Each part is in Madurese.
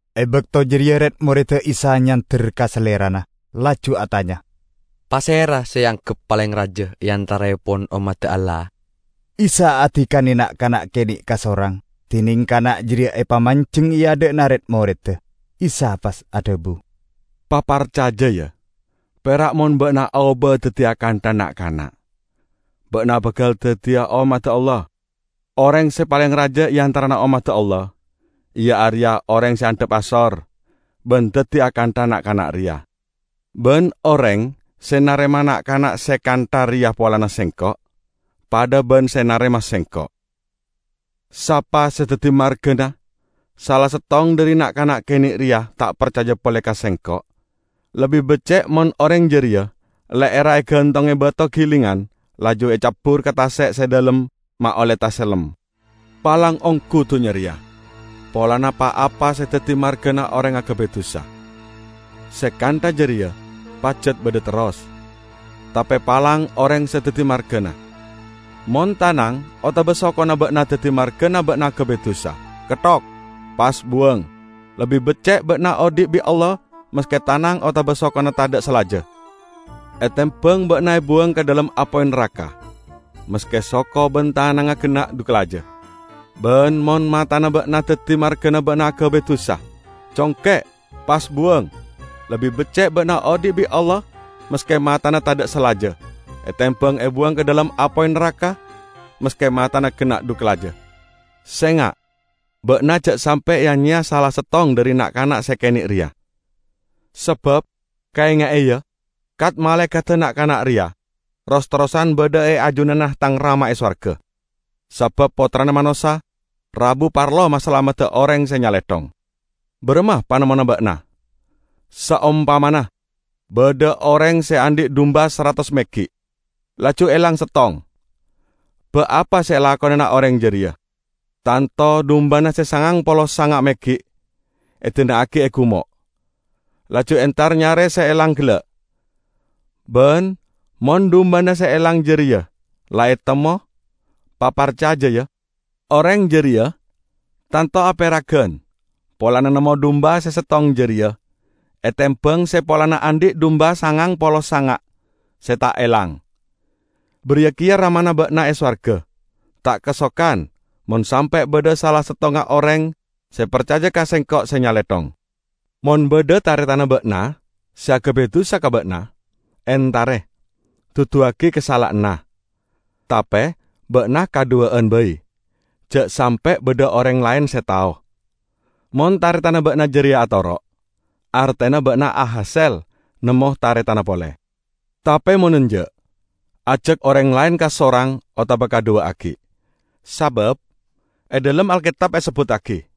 E bakto jareya red-moreddda Isa nyander ka Salerana laju atanya, "Pasera se eanggep paleng raja e antaraepon ommadda Allah?" Isa adikane na'-kana' kene' kasorang, dineng kana' jareya epamanjeng e adha'na red-moredda. Isa pas adhabu, "Paparcaja, ya! Pera' mon ba'na aoba daddi akantha na'-kana', ba'na bakal daddiya ommadda Allah. Oreng se paleng raja e antarana ommadda Allah iya areya oreng se andhap asor ban daddi akantha na'-kana' reya. Ban oreng se narema na'-kana' se kantha reya polana Sengko', padha ban se narema Sengko'." "Sapa se daddi margana sala settong dhari na'-kana' kene' reya ta' parcaja pole ka Sengko', lebbi becce' mon oreng jareya le'erra egantonge bato gilingan laju ecabbur ka tase' se dhalem ma' olle tasellem. Palang onggu dunnya reya polana pa-apa se daddi margana oreng agabay dusa. Se kantha jareya pajat badha terros, tape palang oreng se daddi margana! Mon tanang otaba sokona ba'na daddi margana ba'na agabay dusa, ketthok, pas buwang. Lebbi becce' ba'na odhi' bi' Allah maske tanang otaba sokona tadha' salaja, etembang ba'na ebuwang ka dhalem apoy naraka maske soko ban tanangnga genna' dhu kalaja. Ban mon matana ba'na daddi margana ba'na agabay dusa, congke', pas buwang. Lebbi becce' ba'na odhi' bi' Allah maske matana tadha' salaja etembang ebuwang ka dhalem apoy naraka maske matana genna' dhu kalaja." "Senga'! Ba'na ja' sampe' ya-nyeya sala settong dhari na'-kana' se kene' reya. Sabab kaenga'e, ya, kat-malaekadda na'-kana' reya ros-terrosan badha e ajunanna Tang Rama e sowarga. [ Sabab Pottrana Manossa rabu parlo masalamedda oreng se nyalethong!] Baramma panemmona ba'na? Saompamana badha oreng se andhi' dumba saratos meggi', laju elang settong, ba' apa se elakonana oreng jareya? Tanto dumbana se sangang polo sanga' meggi' edina'agi e gumo', laju entar nyare se elang gella'. Ban mon dumbana se elang jareya la etemmo -- paparcaja, ya -- oreng jareya tanto aperagan polana nemmo dumba se settong jareya etembang se polana andhi' dumba sangang polo sanga' se ta' elang. Bariya keya Ramana ba'na e sowarga ta' kasokan mon sampe' badha sala settonga oreng se parcaja ka Sengko' se nyalethong." "Mon badha taretanna ba'na se agabay dusa ka ba'na, entare, duduwagi kasala'anna. Tape ba'na kadhuwa'an bai, ja' sampe' badha oreng laen se tao. Mon taretanna ba'na jareya atoro', artena ba'na ahasel nemmo taretanna pole. Tape mon enja', ajak oreng laen kasorang otaba kadhuwa' aggi'. Sabab e dhalem Alketab esebbuttagi,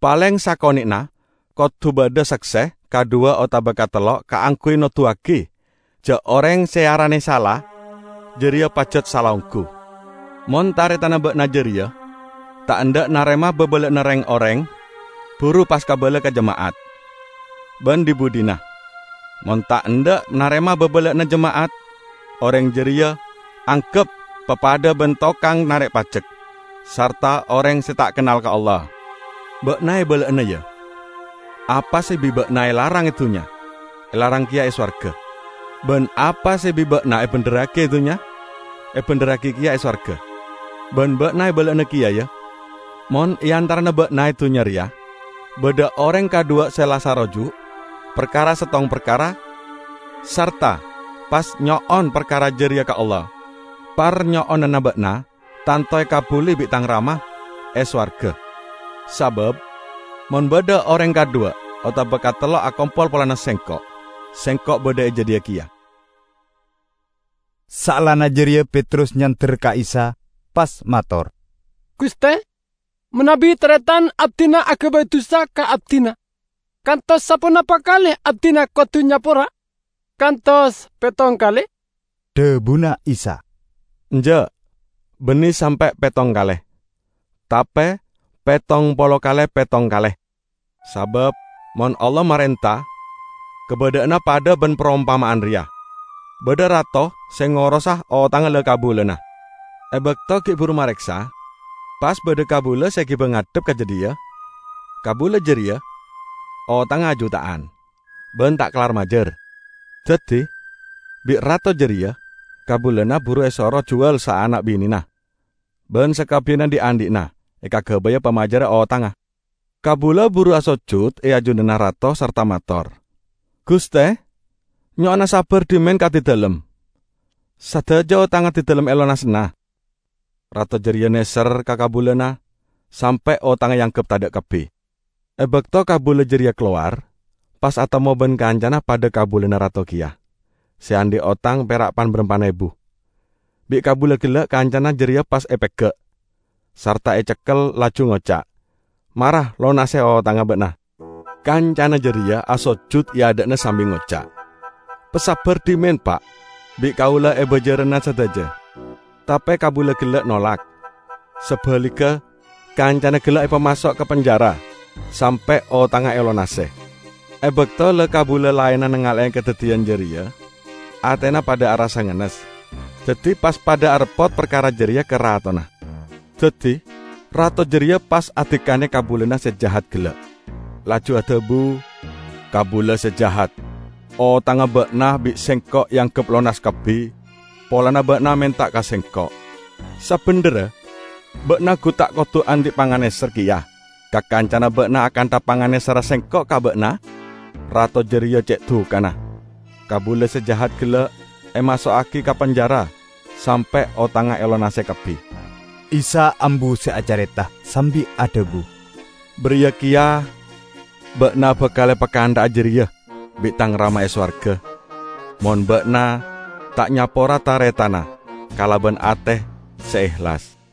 'Paleng sakone'na kodu badha sakse kadhuwa otaba katello kaangguy noduwagi ja' oreng se earane sala jareya pajat sala onggu.' Mon taretanna ba'na jareya ta' endha' narema babala'anna reng-oreng buru pas kabala ka jema'at. Ban dhi-budhina, mon ta' endha' narema babala'anna jema'at, oreng jareya anggep papadha ban tokang narek pajek sarta oreng se ta' kennal ka Allah." "Ba'na ebala'ana, ya: Apa se bi' ba'na elarang e dunnya, elarang keya e sowarga. Ban apa se bi' ba'na ebendherragi e dunnya, ebendherragi keya e sowarga. Ban ba'na ebala'ana keya, ya: Mon e antarana ba'na e dunnya reya badha oreng kadhuwa se la saroju' parkara settong parkara sarta pas nyo'on parkara jareya ka Allah, parnyo'onanna ba'na tanto ekabbuli bi' Tang Rama e sowarga. Sabab mon badha oreng kadhuwa otaba katello akompol polana Sengko', Sengko' badha e jadhiya keya." Saellana jareya Petrus nyander ka Isa, pas mator, "Guste, manabi taretan abdina agabay dusa ka abdina, kantos saponapa kale abdina kodu nyapora? Kantos pettong kale?" Dhabuna Isa, "Enja', banne sampe' pettong kale, tape pettong polo kale pettong kale! Sabab mon Allah marenta, kabadha'anna padha ban parompama'an reya: Badha rato se ngorosa otangnga la-kabulana. E bakto gi' buru mareksa, pas badha kabula se egiba ngadhep ka jadhiya; kabula jareya otangnga ajuta'an, ban ta' kellar majar. Daddi bi' rato jareya kabulana buru esoro juwal saana' binena ban sakabbiyanna dhi'-andhi'na, ekagabaya pamajarra otangnga. Kabula buru asojud e ajunanna rato sarta mator, 'Guste, nyo'ona sabbar dhimen ka abdidalem. Sadaja otang abdidalem elonasana.' Rato jareya neser ka kabulana, sampe' otangnga eanggep tadha' kabbi. E bakto kabula jareya kalowar, pas atemmo ban kancana, padha kabulana rato keya, se andhi' otang pera' pan-barampan ebu. Bi' kabula gella' kancana jareya pas epega', sarta ecekkel, laju ngoca', "Mara lonase otangnga ba'na!' Kancana jareya asojud e adha'na sambi ngoca', 'Pasabbar dhimen, pa', bi' kaula ebajarana sadaja!' Tape kabula gella' nolak. Sabaligga, kancana gella' epamaso' ka penjara sampe' otangnga elonase. E bakto la-kabula laenna nangale'e kadaddiyan jareya, atena padha arassa ngennes, daddi pas pada areppot parkara jareya ka ratona. Daddi rato jareya pas adikane kabulana se jahat gella', laju adhabu, 'Kabula se jahat! Otangnga ba'na bi' sengko' eanggep lonas kabbi polana ba'na menta ka sengko'. Sabendherra ba'na gu ta' kodu andhi' panganeser keya ka kancana ba'na akantha panganeserra sengko' ka ba'na?' Rato jareya ce' dukana. Kabula se jahat gella' emaso'agi ka penjara sampe' otangnga elonase kabbi." Isa ambu se acareta sambi adhabu, "Bariya keya ba'na bakal epakantha'a jareya bi' Tang Rama e sowarga, mon ba'na ta' nyapora taretanna kalaban ate se ehlas."